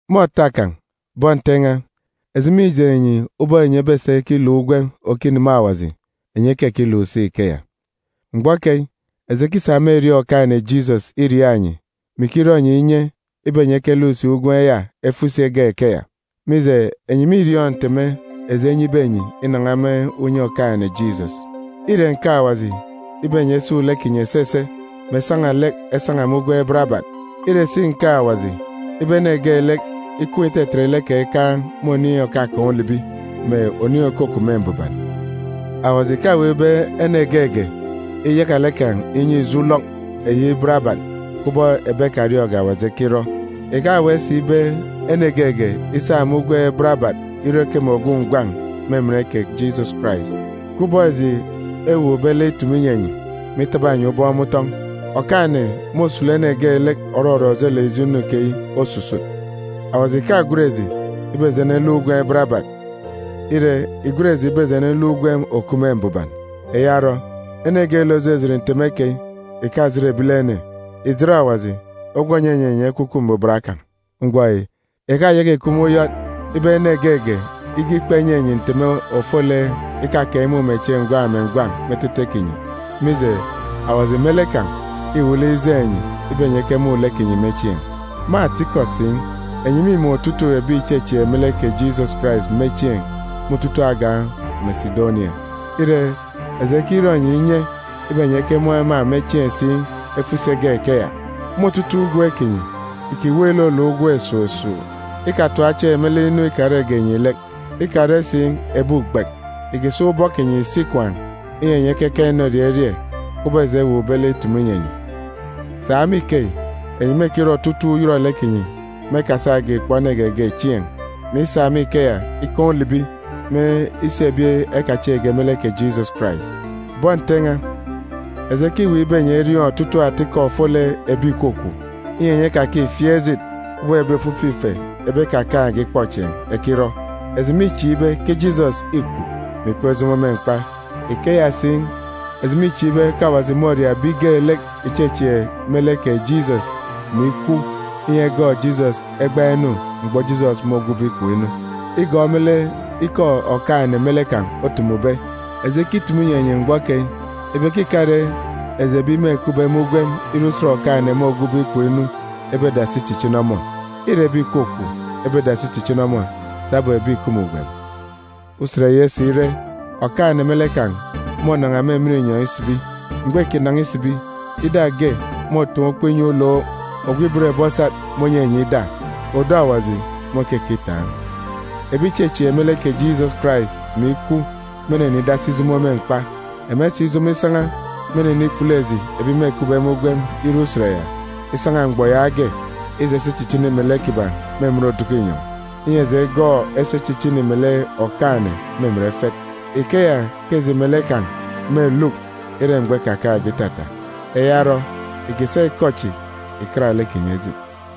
Me òta kan̄, bọn Nte n̄a, eji mîjeen̄ enyi ubọk enyi ebesa ikiluk ugwem òkineme Awaji, enyi ekekiluk si ikeya. Mgbọ keyi, eji ekisa me erieen̄ Okaan̄-ene Jisọs iriaak enyi, mè ikirọ enyi inye ibe enyi ekeluk si ugwem ya efo isi egak ikeya. Mije, enyi mîriọọn̄ nteme eji enyibe enyi inan̄a me unye Okaan̄-ene Jisọs. Îre nkeek Awaji ibe enyi esun̄ lek kinyi esese, mè esan̄a lek esan̄a me ugwem barabat. Îre si nkeek Awaji ibe ene geelek ikween̄ itetet lek kan̄ ikaan̄ me oniin̄ òkakaan̄ ulibi, mè oniin̄ òkukup me mbuban. Awaji ìkaweek ibe ene geege iyaka lek kan̄ inyi ijo ulọk eyi barabat kubọk ebi ekariọọn̄ge Awaji ekirọ. Ìkaweek si ibe ene geege isa me ugwem barabat irọ ikeme ogwu ngwan̄ me emen kè Jisọs Karais. Kubọk eji ewuukbe lek itumu inyi enyi, mè itaba enyi ubọk me utọn̄, Okaan̄-ene môsulu ene geelek òrọrọ ojelek ijo inu keyi osusut. Awaji ìkagwen eji ibe eji eneluk ugwem barabat. Ire, ìgwen eji ibe eji eneluk ugwem òkup me mbuban. Eya orọ, ene geelek òjijit nteme keyi ìkajit ebilene, ìjit Awaji ogwu ònyinyi enyi Ekwukwu Mbuban kan̄. Mgbọ yi, ìkayaka ìkup me uyọt ibe ene geege ige ikpa inyi enyi nteme ofolek ikakaan̄ imumechieen̄ ngwan̄ mè ngwan̄ me etete kinyi, mije, Awaji me lek kan̄ îwuuk lek ijeen̄ enyi ibe enyi ekemun̄ lek kinyi me chieen̄. Me atikọ si, enyi mîmun̄ otutuuk ebi ìchechieek me lek kè Jisọs Karais me chieen̄ me otutuuk agan̄ Mesidonia. Ire, eji ekirọ enyi inye ibe enyi ekemun̄ ema me chieen̄ si efo isi egak ikeya. Me otutuuk ugwem kinyi, ìkiweek iluluk ugwem esuuk esuuk, ikatap chieen̄ me lek inu ikarege enyi lek. Ikare si ebi ugbek, ìkisa ubọk kinyi ìsi ikwaan̄, inyi enyi ekekaan̄ inorie erie, kubọk eji ewuukbe lek itumu inyi enyi. Sa me ikeyi, enyi mêkirọ otutuuk uyọrọlek kinyi me ekasage ìkpọ ene geege chieen̄, mè isa me ikeya ikaan̄ ulibi me isi ebi ekachieekge me lek kè Jisọs Karais. Bọn Nte n̄a, eji ekiweek ibe enyi eriọọn̄ otutuuk atikọ ofolek ebi ìkwakwaan̄, inyi enyi ekakifieek ejit kubọk ebi ofifi ife ebi ekakaan̄ge ikpọchieen̄ ekirọ. Eji mîchieek ibe ke Jisọs îkwu, mè ikpọk ijomo me mkpa. Ikeya si, eji mîchieek ibe ke Awaji môria ebi geelek ìchechieek me lek kè Jisọs mè ikwaan̄, inyi egọọk Jisọs egbaan̄ enu mgbọ Jisọs môgwube ikom inu. Igọọk me lek ikọ Okaan̄-ene me lek kan̄ otumube, eji ekitumu inyi enyi mgbọ keyi ibe ke ìkare eji ebi mêkupbe me ugwem ire Usen Okaan̄-ene môgwube ikom inu ebedasi ichichini ọmọ. Îre ebi ìkwakwaan̄ ebedasi ichichini ọmọ sabum ebi ìkup me ugwem. Usen ya isire, Okaan̄-ene me lek kan̄ mônan̄a me emen inyọn̄ isibi. Mgbọ môkinan̄a isibi, ida ge môtaan̄ ukpo inyi ulook, ogwu ibot ebi osat mônyinyi ida, otita Awaji môkekitaan̄. Ebi ìchechieek me lek kè Jisọs Karais mè ikwu mênenidasi ijomo me mkpa. Ema isijomo isan̄a, mênenikpulu eji, ebi mêkupbe me ugwem ire Usen ya, isan̄a mgbọ yaage isa isi ichichini melek kiban̄ me emen oduku inyọn̄, inyi eji egọọk esi echichini melek Okaan̄-ene me emen efet. Ikeya ke eji melek kan̄ ebeluk ire mgbọ ikakaan̄ge itata. Eya orọ, ìkisa ikọ chi ìkat lek kinyi ejit.